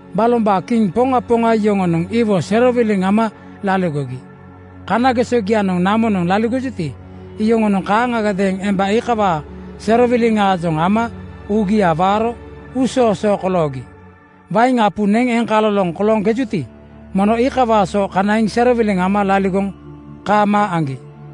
Balombaa kiŋ poŋa poŋa yoŋonoŋ iwo serowiliŋ ama laligogi. Kanagesogianoŋ namonoŋ laligojuti, iyoŋonoŋ kaaŋagadeeŋ emba iikawaa serowiliŋaajoŋ ama uugia waaro uusoosoo koloogi. Wain apu neŋ eŋkaloloŋ kolooŋkejuti, mono iikawaa so kanaiŋ serowiliŋ ama laligoŋ kaamaa aŋgi.”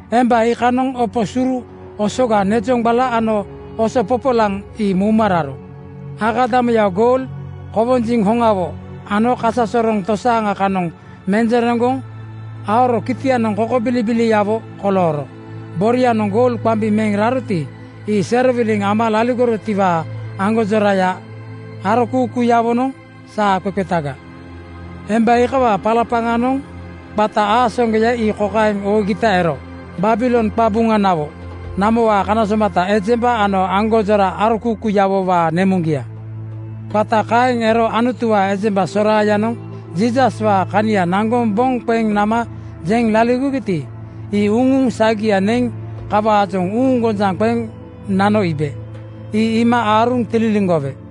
Emba iikanoŋ opo suru osoga nezoŋgbala ano oso popolaŋ ii mouma raro. Akadamuya goul, kowonjiŋ hoŋawo ano kasasoroŋ tosaaŋa kanoŋ menjereŋgoŋ aoro kaitanianoŋ kokobilibiliawo kolooro. Borianoŋ goul qambi meŋ raroti, ii serowiliŋ ama laligorotiwaa aŋgonjoraya arokuukuuyawonoŋ saa qeqetaga. Emba iikawaa palapaŋanoŋ qata aasaŋgoya ii kokaeŋ oogita ero, “Babilon qabuŋanawo, namowaa kana somata ejemba ano aŋgonjora arokuukuuyawowaa nemuŋgia.” Qata kaeŋ ero Anutuwaa ejemba soraayanoŋ Jiisaswaa kania naŋgoŋ boŋ qeŋ nama jeŋ laligogiti, ii uŋuŋ sagia neŋ kawaajoŋ uuŋgonjaŋ qeŋ nano iibe. Ii iima aaruŋ tililiŋgowe.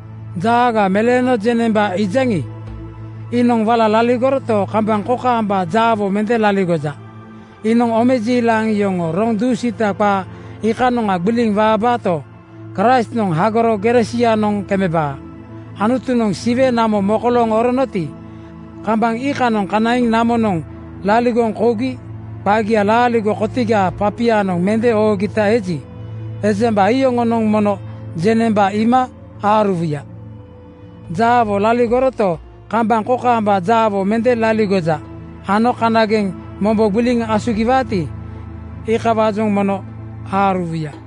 Jaaga meleeno jeŋnemba iijaŋi, iinoŋ wala laligoroto, kambaŋ kokaamba jaawo mende laligoja. Iinoŋ omejiilaŋ yoŋoo roŋ dusiita qaa iikanoŋa gbiliŋ waabaato, Kraistnoŋ hagoro gere sianoŋ kemebaa. Anutunoŋ Siwe namo mokolooŋ oronoti, kambaŋ iikanoŋa kanaiŋ namonoŋ laligoŋ kougi qagia laaligo kotigaa papianoŋ mende oogita eji, ejemba iyoŋonoŋ mono jeŋnemba iima aaruwuya. Jaawo laligoroto, kambaŋ kokaamba jaawo mende laligoja ano kanageŋ mombo gbiliŋ asugiwaati, iikawaajoŋ mono aaruwuya.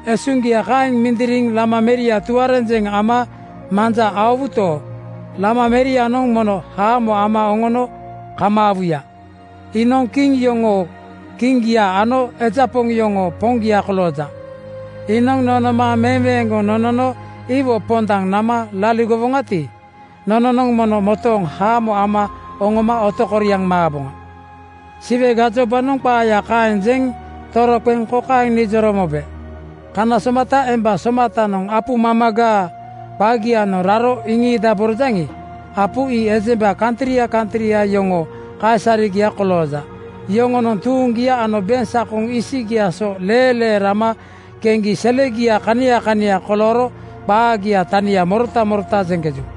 Esuŋgia kaeŋ mindiriŋ Lama meria tuarenjeŋ ama manja aowuto, Lama merianoŋ mono haamo ama oŋono kamaawuya. Iinoŋ kiŋ yoŋoo Kiŋgia ano eja poŋ yoŋoo Poŋgia kolooja. Iinoŋ nonooma meweeŋgoŋ nonono iwo pondaŋ nama laligowoŋati, nononoŋ mono motooŋ haamo ama oŋoma otokoriaŋ maaboŋa.” Siwe gajobanoŋ qaaya kaeŋ jeŋ toroqeŋ kokaeŋ nijoro mobe, “Kana somata emba somatanoŋ apu mamagaa qagianoŋ raro iŋiidaborojaŋi, apu ii ejemba kantria kantria yoŋoo kaisaregia kolooja. Yoŋonoŋ tuuŋgia ano beŋsakoŋ isigiaa so leelee rama keŋgi selegia kania kania kolooro qaagia tania morota morota jeŋkeju.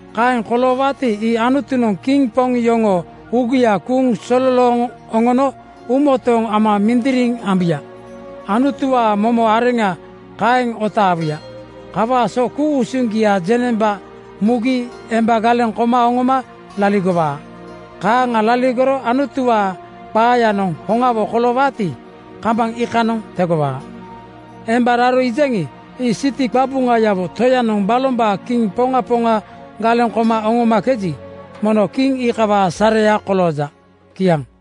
“Kaeŋ koloowaati, ii Anutunoŋ kiŋ poŋ yoŋoo uugia kuuŋ sololooŋ oŋono uumotooŋ ama mindiriŋ ambuya. Anutuwaa momo areŋa kaeŋ otaawuya. Kawaa so ku-usuŋgia jeŋnemba mugi ejemba galeŋ koma oŋoma laligowaa. Kaaŋa laligoro Anutuwaa qaayanoŋ hoŋawo koloowaati, kambaŋ iikanoŋ tegowaa. Emba raro iijaŋi, ii siti qabuŋayawo toyanoŋ balombaa kiŋ poŋa poŋa galeŋ koma oŋomakeji, mono kiŋ iikawaa sareya kolooja.” Kiaŋ.